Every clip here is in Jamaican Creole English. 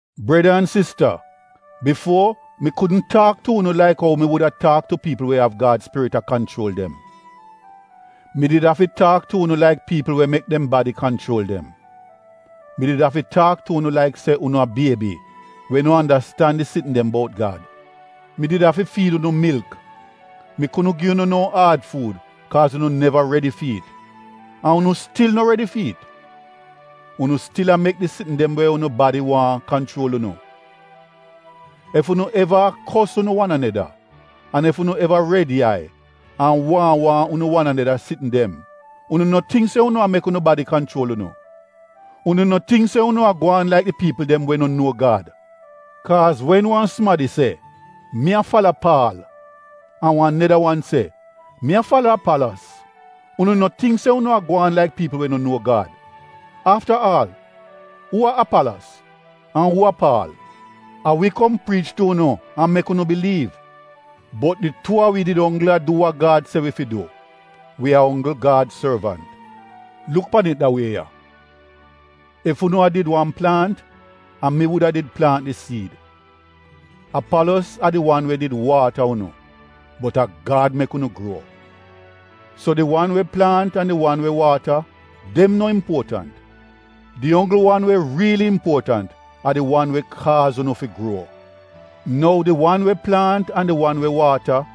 Breda an sista, bifuo mi kudn taak tu unu laik ou mi wuda taak tu piipl we av Gad Spirit a kanchuol dem. Mi did afi taak tu unu laik piipl we mek dem badi kanchuol dem — mi did afi taak tu unu laik se unu a biebi we no andastan di sitn dem bout Gad. Mi did afi fiid unu milk, mi kudn gi unu no aad fuud kaaz unu neva redi fi it. An unu stil no redi fi it. Unu stil a mek di sitn dem we unu badi waahn kanchuol unu. Ef unu eva a kos unu wan aneda, an ef unu eva red yai an waahn waahn unu wan aneda sitn dem, unu no tingk se unu a mek unu badi kanchuol unu? Unu no tingk se unu a gwaan laik di piipl dem we no nuo Gad? Kaaz wen wan sumadi se, “Mi a fala Paal” an wan neda wan se, “Mi a fala Apalos,” unu no tingk se unu a gwaan laik piipl we no nuo Gad? Afta aal, uu a Apalos? An uu a Paal? A wi kom priich tu unu an mek unu biliiv bot di tuu a wi did onggl a du wa Gad se wi fi du. Wi a onggl Gad sorvant. Luk pan it da wie ya, ef unu a did wan plaant, a mi wuda did plaant di siid. Apalos a di wan we did waata unu bot a Gad mek unu gruo. So di wan we plaant an di wan we waata, dem no impuotant. Di onggl wan we riili impuotant a di wan we kaaz unu fi gruo. Nou di wan we plaant an di wan we waata,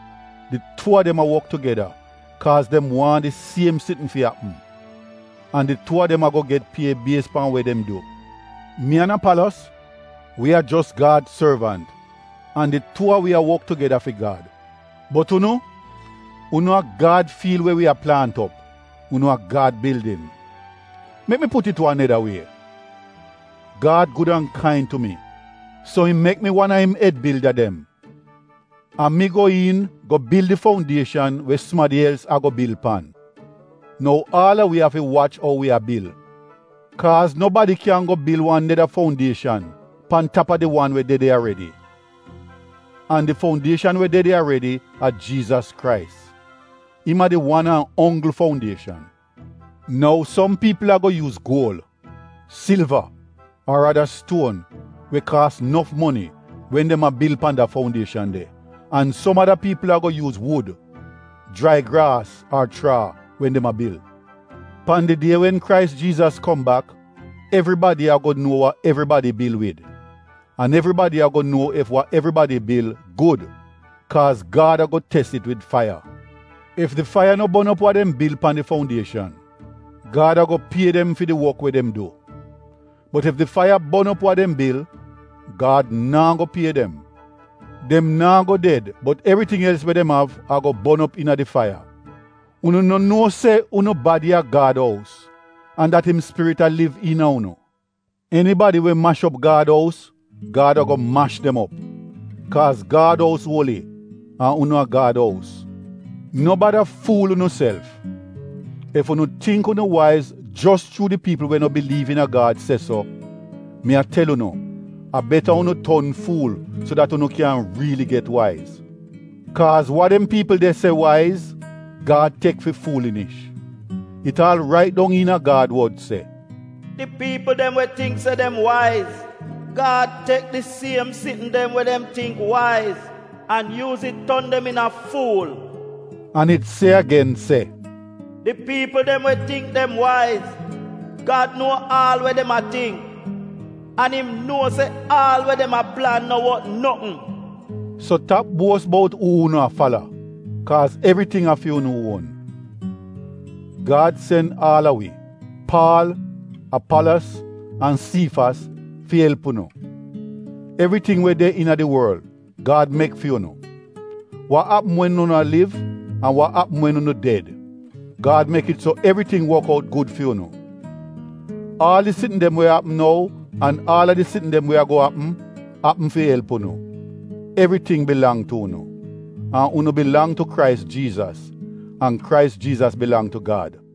di tuu a dem a wok tugeda kaaz dem waahn di siem sitn fi apm. An di tuu a dem ago get pie bies pan we dem du. Mi an Apalos, wi a jos Gad sorvant an di tuu a wi a wok tugeda fi Gad. Bot unu, unu a Gad fiil we wi a plaant op, unu a Gad bildin. Mek mi put it wan neda wie. Gad gud an kain tu mi, so im mek mi wan a im ed bilda dem. A mi go iin go bil di foundieshan we sumadi els ago bil pan. Nou aal a wi afi wach ou wi a bil. Kaaz nobadi kyan go bil wan neda foundieshan pan tap a di wan we de de aredi. An di foundieshan we de de aredi a Jiizas Krais. Im a di wan an onggl foundieshan. Nou som piipl ago yuuz guol, silva ar ada stuon we kaas nof moni wen dem a bil pan de foundieshan de. An som ada piipl ago yuuz wud, jrai graas ar chraa wen dem a bil. Pan di die wen Krais Jiizas kom bak evribadi ago nuo wa evribadi bil wid an evribadi ago nuo ef wa evribadi bil gud kaaz Gad ago tes it wid faiya. Ef di faiya no bon op wa dem bil pan di foundieshan, Gad ago pie dem fi di wok we dem du. Bot ef di faiya bon op wa dem bil, Gad naa go pie dem. Dem naa go ded bot evriting els we dem av ago bon op iina di faiya. Unu no nuo se unu badi a Gad ous an dat im Spirit a liv iina unu? Enibadi we mash op Gad ous, Gad ago mash dem op. Kaaz Gad ous uoli an unu a Gad ous. No bada fuul unuself. Ef unu tingk unu waiz jos chuu di piipl we no biliiv iina a Gad se so, mi a tel unu a beta unu ton fuul so dat unu kyan riili get waiz. Kaaz wa dem piipl de se waiz, Gad tek fi fuulinish. It aal rait dong iina Gad wod se, “Di piipl dem we tingk se dem waiz, Gad tek di siem sitn dem we dem tingk waiz an yuuz it ton dem iina fuul.” An it se agen se, “Di piipl dem we tingk dem waiz Gad nuo aal we dem a tingk. An im nuo se aal we dem a plan no wot notn.” So tap buos bout uu unu a fala, kaaz evriting a fi unu uon. Gad sen aal a wi: Paal, Apalos an Siifas fi elp unu. Evriting we de iina di worl, Gad mek fi unu. Wa apm wen unu a liv an wa apm wen unu ded, Gad mek it so evriting wok out gud fi unu. Aal di sitn dem we apm nou an aal a di sitn dem we ago apm — apm fi elp unu. Evriting bilang tu unu. An unu bilang tu Krais Jiizas, an Krais Jiizas bilang tu Gad.